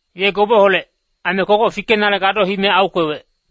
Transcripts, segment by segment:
Ye gobeholec, aime kogoc fikenale gado hime aukwewec.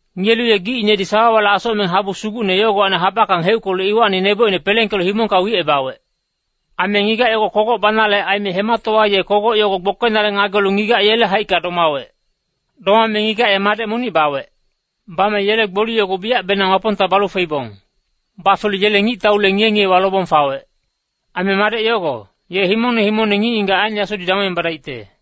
Ngiyelu ye gicinedi sawawale asocmeng habu sugucne yogowacni habackang heuckelu iwacni nebocine pelengkelu himongka wicebawec. Aime ngigac yogo kogoc banale aime hematowa ye kogoc yogo gbokenale ngagelu ngigac yele haicka domawec. Domame ngigac ye madec monic bawec. Bame yele gboli yogo biyacbenang Wapongta balu feibong. Bafelu yele ngictaule ngiye-ngiyewa lobong fawec. Aime madec yogo, ye himongne himongne ngic-ngigac aen yasudi damongebadaicte.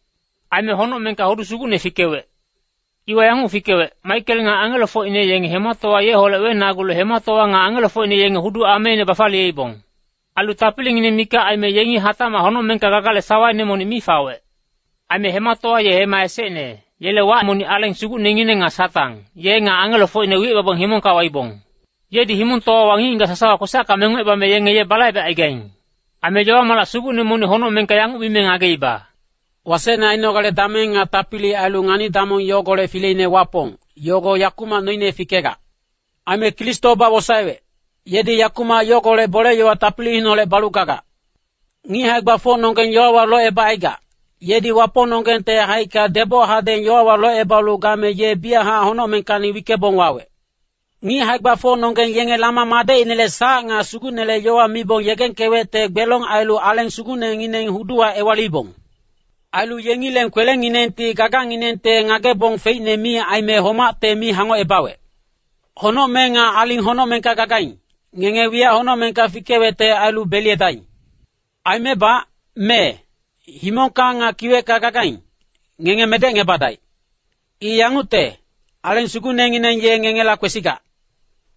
Aime honocmengka hudu sugucne fikewec. Iwa yanguc fikewec, Maikel nga angelofocine yenge hematowa yeholec wenagulu hematowa nga angelofocine yenge hudu ameine bafaliyeibong. Ailu tapilingineng mikac aime yengi hatacmac honocmengka gagale sawaine monic mi fawec. Aime hematowa ye hema esecne, yele wac monic Aleng Sugucnengineng nga Satang, ye nga angelofocine wicebabong himongka waibong. Yedi himongtowawa ngic-ngigac sasawa kwesacka mengocebame yenge ye balaibecaigaing. Aime yowa-malac sugucne monic honocmengka yanguc mime ngageiba, “Wasecne ainogale dameng nga tapili ailu ngani-damong yogolec fileine Wapong, yogo yakumac noine fikegac. Aime Kristo bawosaewec, yedi yakumac yogolec bole-yowa tapiliineholec balu gagac. Ngic hae-gbafocnonggeng yowawa locebacaigac, yedi Wapongnonggengte haicka deboc hadeng yowawa locebalu game ye biyachac honocmengkacni wickebong wawec. Ngic hae-gbafocnonggeng yenge Lama madecinele sac nga Sugucnele yowa mibong yegengkewecte gbelong ailu Aleng Sugucnengineng huduwa ewaliibong. Ailu yengileng kwelenginengti gaganginengte ngagebong feicne mi aime homacte mi hangocebawec. Honocmeng nga aling honocmengka gacaigaing, ngenge wiyac honocmengka fikewecte ailu beliyedaing. Aimebac, mee, himongka nga kiwecka gagaing, ngenge medecngebadaic. I yangucte, Aleng Sugucnengineng ye ngengela kwesigac.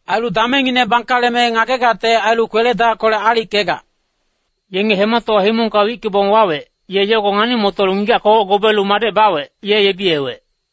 Ailu damengngine bangkaleme ngagegacte ailu kwele-dackolec aalickegac.” Yenge hematowa himongka wickebong wawec, ye yogo ngani-motolu ngigac kogoc gobeelu madec bawec, ye yebiyewec.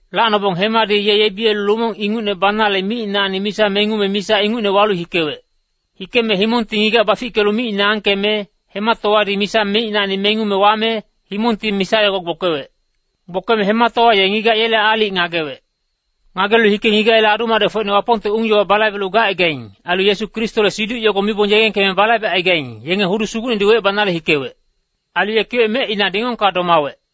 Lacnobong hemadi ye yebiyelu lumong ingucne banale micinacni misa mengume misa ingucne walu hikewec. Hikeme himongti ngigac bafickelu micine angkeme, hematowadi misa micinacni mengume wame, himongti misa yogo gbokewec. Gbokeme hematowa ye ngigac yele aalic ngagewec. Ngagelu hike ngigac yele adu-madecfocine Wapongte ung-yowa balaibelu gacaigaing, ailu Yesu Kristole siduc yogo mibong yegengkeme balaibecaigaing, yenge hudu sugucnedi wecebanale hikewec. Ailu ye kiwec mecina dingongka domawec.